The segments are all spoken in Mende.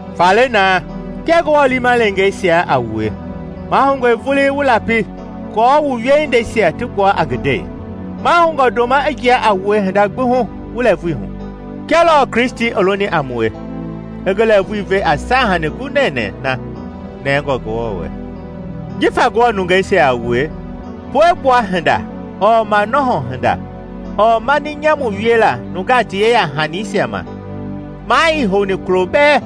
Faale naa, kia Ngewɔ liima leengeisia a wue, mahoungɔe vulii wu lapi aako wu wiehindeisia ti gbua a ngi ndei. Mahoungɔ ndoma i jia a wue hinda gbi hu wu lɛɛvui hu, kia lɔɔ Kristi i loni a mue, i ngi lɛɛvui ve a saahanii gu nɛnɛɛ na nɛngɔ Ngewɔ wɛ. Jifa Ngewɔ nungeisia a wue, puegbua hinda ɔɔ manɔhɔ hinda ɔɔ mani nyamu wiela nungaa ti yeya-hanisia ma, maa ii houni kulo bɛɛ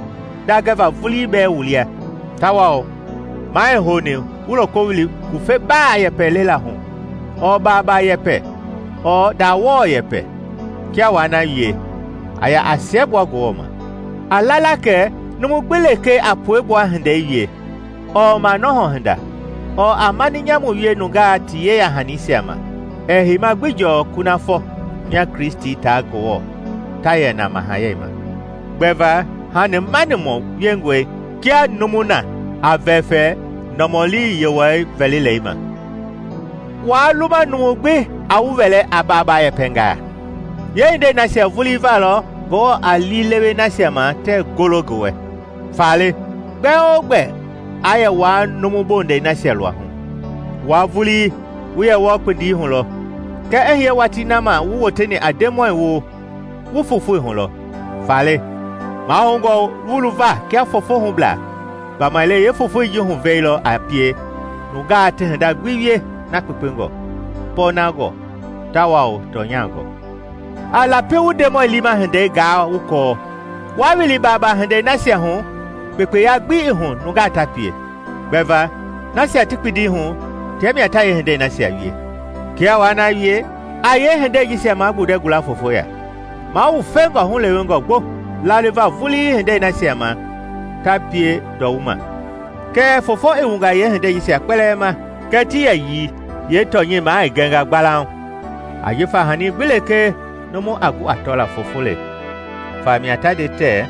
ndaa gɛva vulii bɛɛ wu lia. Tawao maa ii houni wu loko wili ngufeba yɛpɛ lela hu ɔɔ baaba yɛpɛ ɔɔ ndawɔ yɛpɛ. Kia waa na wie, a ya a siɛgbua Ngewɔ ma. A la la kɛ numu gbi lekee a puegbua hindei wie ɔɔ manɔhɔ hinda ɔɔ a mani nyamu wie nungaa ti yeya-hanisia ma ɛɛ heima gbi jɔɔ kunafɔ mia Kristi taa Ngewɔ ta yɛ na mahayɛi ma; gbɛva hanimanimɔ wiengɔi kia numu na a vɛfɛ nɔmɔli yewɔi vɛlilei ma Waa luma numu gbi aa wu wɛlɛ a baabaa yɛpɛngaa; yeehindei nasia vulii va lɔ Ngewɔ a liilewe nasia ma tɛɛ golo ngi wɛ. Faale gbɛ-o-gbɛ aa yɛ wua numu bondɛi nasia luahu. Wua vulii wu yɛ wɔɔ kpindi hu lɔ, kɛɛ i hiye watii na ma wu woteni a Ndemɔi woo, wu fofoi hu lɔ. Faale mahoungɔ wu luva kia fofohublaa, gbamaile yeefofoi ji huvei lɔ a pie nungaa ti hinda gbi wie na kpekpengɔ, pɔɔnangɔ, tawao tɔnyangɔ. A lapi wu Ndemɔi liima hindei gaa wu kɔɔ. Waa wili baabaa hindei nasia hu kpekpeya gbi ii hu nungaa ta pie, gbɛva nasia ti kpindi hu tia mia ta yeehindei nasia wie. Kia waa na wie, a yeehindei jisia magbundɛ gula fofoya. Mawufengɔe hulewengɔ gbo laliva vulii hindei nasia ma ta pie ndɔwuma. Kɛɛ foofo i wungaa yeehindei jisia kpɛlɛɛ ma kɛ ti yɛyii yeetɔnyɛi maa i gɛnga gbalauŋ. Ajifa hani gbi lekee numu a gu a tɔla, foofo le. Famia ta nde tɛ: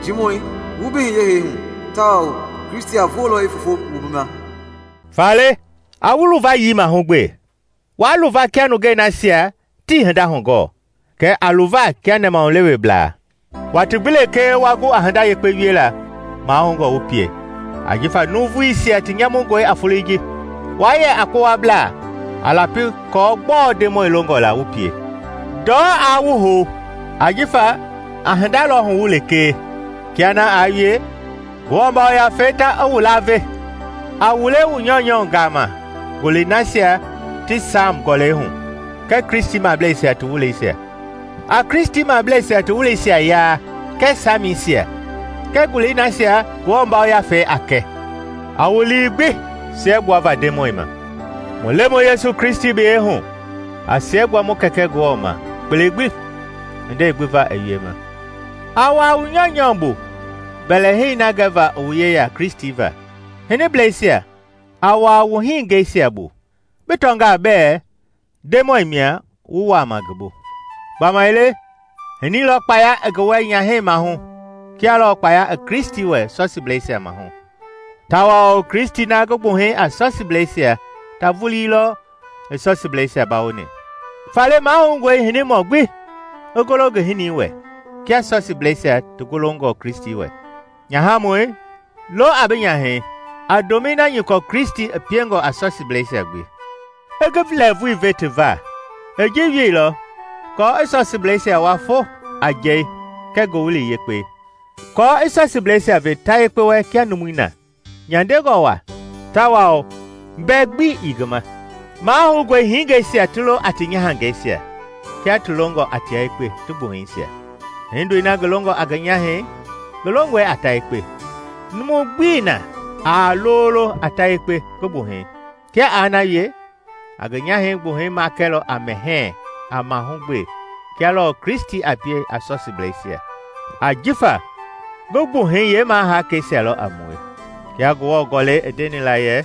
“Njiimɔi, wu, bi hiye hee hu, tawao Kristi a voolɔ i foofo wu bi ma.” Faale a wu luvayii mahugbe. Waa luva kia nungei nasia tii hinda hugɔɔ, kɛɛ a luva kia nɛmahuleweblaa. Watii gbi lekee wa gu a hinda yekpe wiela mahoungɔ wu pie, ajifa nuuvuisia ti nyamungɔe a folei ji. Waa yɛ a kpowablaa, a lapi kɔɔ gbɔɔ Ndemɔi longɔ la wu pie. Ndɔ aa wu hou, ajifa a hinda lɔ huwu lekee; kia na aa wie, Ngewɔ Yafei ta i wu laave. A wule wu nyɔunyɔ gama ngulei nasia ti Saam Gɔlɛi hu kɛɛ Kristimableisia ti wuleisia; a Kristimableisia ti wuleisia yaa kɛɛ Saamisia kɛɛ ngulii nasia Ngewɔ Yafei a kɛ, a wu lii gbi siɛgbuava Ndemɔi ma. Mu Lemɔi Yesu Kristi biyɛi hu a siɛgbua mu Kɛkɛ Ngewɔ ma kpele gbi hindei gbi va i wiema. A wuaa wu nyɔunyɔ bu mbɛlɛhei na gɛva i wu yeya Kristi va. Hiniblɛisia, a wuaa wu hiningɛisia bu, bi tɔngaa bɛɛ Ndemɔi mia wu wuama ngi bu. Gbamaile hinii lɔ kpaya i ngi wɛ nyahɛi maahu kia lɔɔ kpaya i Kristi wɛ sɔsiblɛisia maahu; tawao Kristi na ngi gbuhei a sɔsiblɛisia ta vulii lɔ i sɔsiblɛisia bawoni. Faale mahoungɔe hinimɔ gbi i golo ngi hinii wɛ kia sɔsiblɛisia ti golongɔ Kristi wɛ. Nyahamɔi, lo a bi nyahɛi a ndomɛi na nyɔkɔ Kristi i piengɔ a sɔsiblɛisia gbi, i ngi lɛɛvui ve ti va. I ji wieilɔ kɔɔ i sɔsiblɛisia wua fo a njɛi kɛɛ Ngowili Yekpei; aako i sɔsiblɛisia ve ta yekpe wɛ kia numui na, nyandengɔ waa tawao mbɛ gbi ii ngi ma. Mahoungɔe hingeisia ti lo a ti nyahangɛisia kia ti longɔ a tia yekpe ti gbuhɛisia. Hindoi na ngi longɔ a ngi nyahɛi ngi longɔe a ta yekpe. Numu gbii na aa lolo a ta yekpe ngi gbuhɛi. Kia aa na wie, a ngi gbuhɛi makɛlɔ a mɛhɛɛ, a mahugbe, kia lɔɔ Kristi a pie a sɔsiblɛisia, ajifa ngi gbuhɛi yeemaahakɛisia lɔ a mue. Kia Ngewɔ Gɔlɛi i ndeni la yɛ,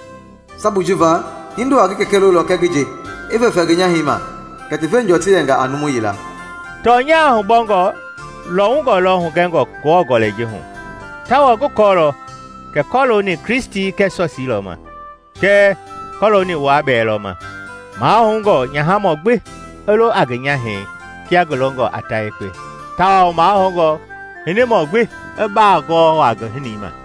“Sabui ji va, hindo a ngi kɛkɛ lolɔ kɛɛ ngi nje i vɛfɛ ngi nyahɛi ma, kɛ ti veengɔ ti yɛnga a numu yila.” Tɔnya hubɔngɔ lɔwungɔ lɔ hugɛngɔ Ngewɔ Gɔlɛi ji hu, tawao ngi kɔɔlɔ kɛ kɔlooni Kristi kɛɛ sɔsii lɔ ma. Kɛɛ kɔlooni wua bɛɛ lɔ ma: mahoungɔ nyahamɔ gbi i lo a ngi nyahɛi kia ngi longɔ a ta yekpe tawao mahoungɔ hinimɔ gbi i baa gɔɔ waa ngi hinii ma.